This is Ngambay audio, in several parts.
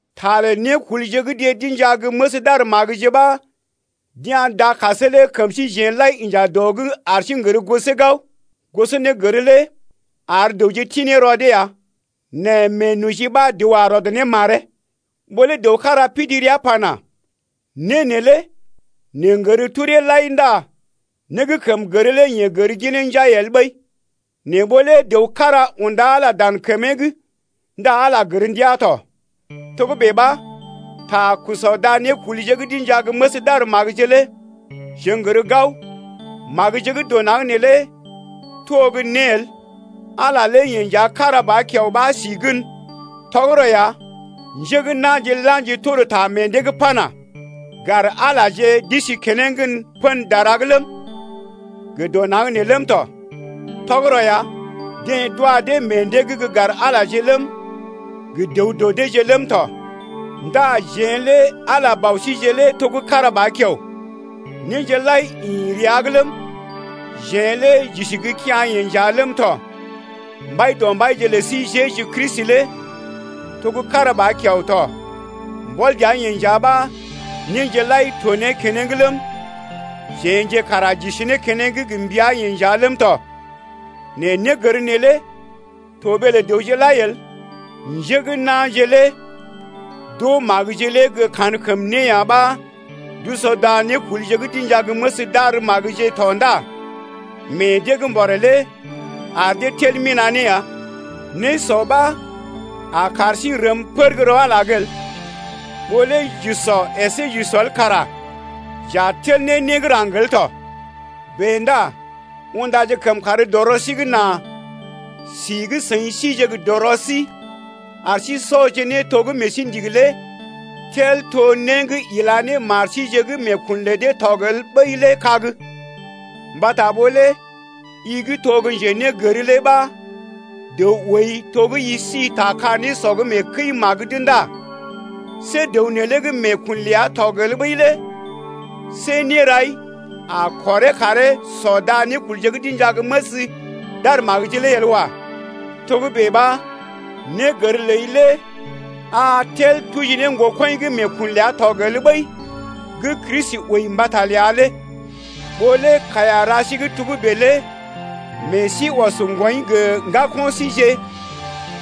Ta lə nékulje gə́ deḛ d’inja gə́ məs d’ar magəje ɓa d’ya̰ dakasee lé kəm síjeḛ lai inja dɔ’g ar sí n’gər gosee gao. Gosɔnégər lé ar dəwje ti ne rɔ dee ya nɛ meenoji ɓa dəw a rɔd ne maree. Ɓó lé dəw kára pidi rəa pana: Né neelé neḛ n’gər kəmee maji ndá né gə́ kəm gər lé yeḛ gər ginee njai el ɓəi. Nɛ ɓó lé dəw kára unda Ala dan kəmee’g ndá Ala gər ndiaa tɔ. Togə́bè ɓa, ta sɔ da nékulje gə́ d’inja gə́ məs d’ar magəje lé jeḛ n’gər gao magəje gə́ dɔ naŋg neelé to gə́ né el. Ala lé yeḛ nja kára ba kiao ɓa si gən. Tɔgərɔ ya, njé gə́ na̰je la̰ji tor ta meḛ dee’g pana: Gar Alaje d’isi keneŋ pə̰ dara’g ləm, gə dɔ naŋg nee ləm tɔ. Tɔgərɔ ya, deḛ d’wa dee meḛ dee’g gə́ gar Alaje ləm, gə dəw dɔ deeje ləm tɔ. Ndá jeḛ lé Ala lé Bɔ síje lé to kára ba kiao. Néje lai ḭ rəa’g ləm, jeḛ lé j’isi gə́ kea̰-yeḛ nja ləm tɔ. Mbaidɔmbaije lə sí Jeju Kristi lé to gə́ kára ba kiao tɔ. Mbɔl dəa-yeḛ nja ɓa néje lai to ne keneŋ ləm, jeḛje kara j’isi ne keneŋ gə mbəa-yeḛ nja ləm tɔ. Nɛ négər neelé to ɓee lə dəwje lai el. Njé gə́ na̰je lé d’oo magəje lé gə́ kankəmné ya ɓa d’usɔ da nékulje gə́ d’inja gə́ məs d’ar magəje tɔ ndá meḛ dee gə́ mbɔré lé ar dee tel mina̰ ne ya. Nésɔ ɓa a kar sí rəm pər gə́ rɔ Ala’g el. Ɓó lé j’usɔ əsé j’usɔ el kara j’a tel ne né gə́ raŋg el tɔ. Bèe ndá undaje kəmkàr dɔ rɔ sí’g nà si gə́ seḭ sije gə dɔrɔ sí ar sí sɔje né to gə́ meḛ sí ndigi lé tel to né gə́ ila ne mar síje gə́ meekun lə dee tɔg el ɓəi lé kag. Mbata ɓó lé i gə́ to gə́ njenégər lé ɓa dəw ooi to gə́ i si ta ka nésɔ’g mee kəi-magə’d ndá see dəw neelé gə́ meekun ləa tɔg el ɓəi lé see nérai a kɔree karee sɔ da nékulje gə́ d’inja gə́ məs d’ar magəje lé el wa. Togə́bè ɓa négər ləi lé a tel tuji ne ŋgokɔḭ gə́ meekun ləa tɔg el ɓəi gə́ Kristi wəi mbata ləa lé. Ɓó lé kaiya ra sí gə́ togə́bè lé meḛ sí ɔs ŋgwɔḭ gə ŋgako̰ síje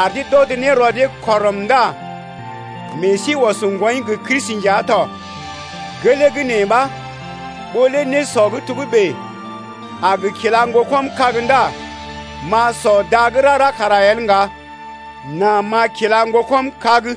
ar dee d’ɔd ne rɔ dee kɔrəm ndá meḛ sí ɔs ŋgwɔḭ gə Kristi nja tɔ. Gelee gə́ nee ɓa, ɓó lé nésɔ gə́ togə́bè a gə kila ŋgokɔm kag ndá m’a sɔ da gə́ rara kara el ŋga, nà m’a kila ŋgokɔm kag.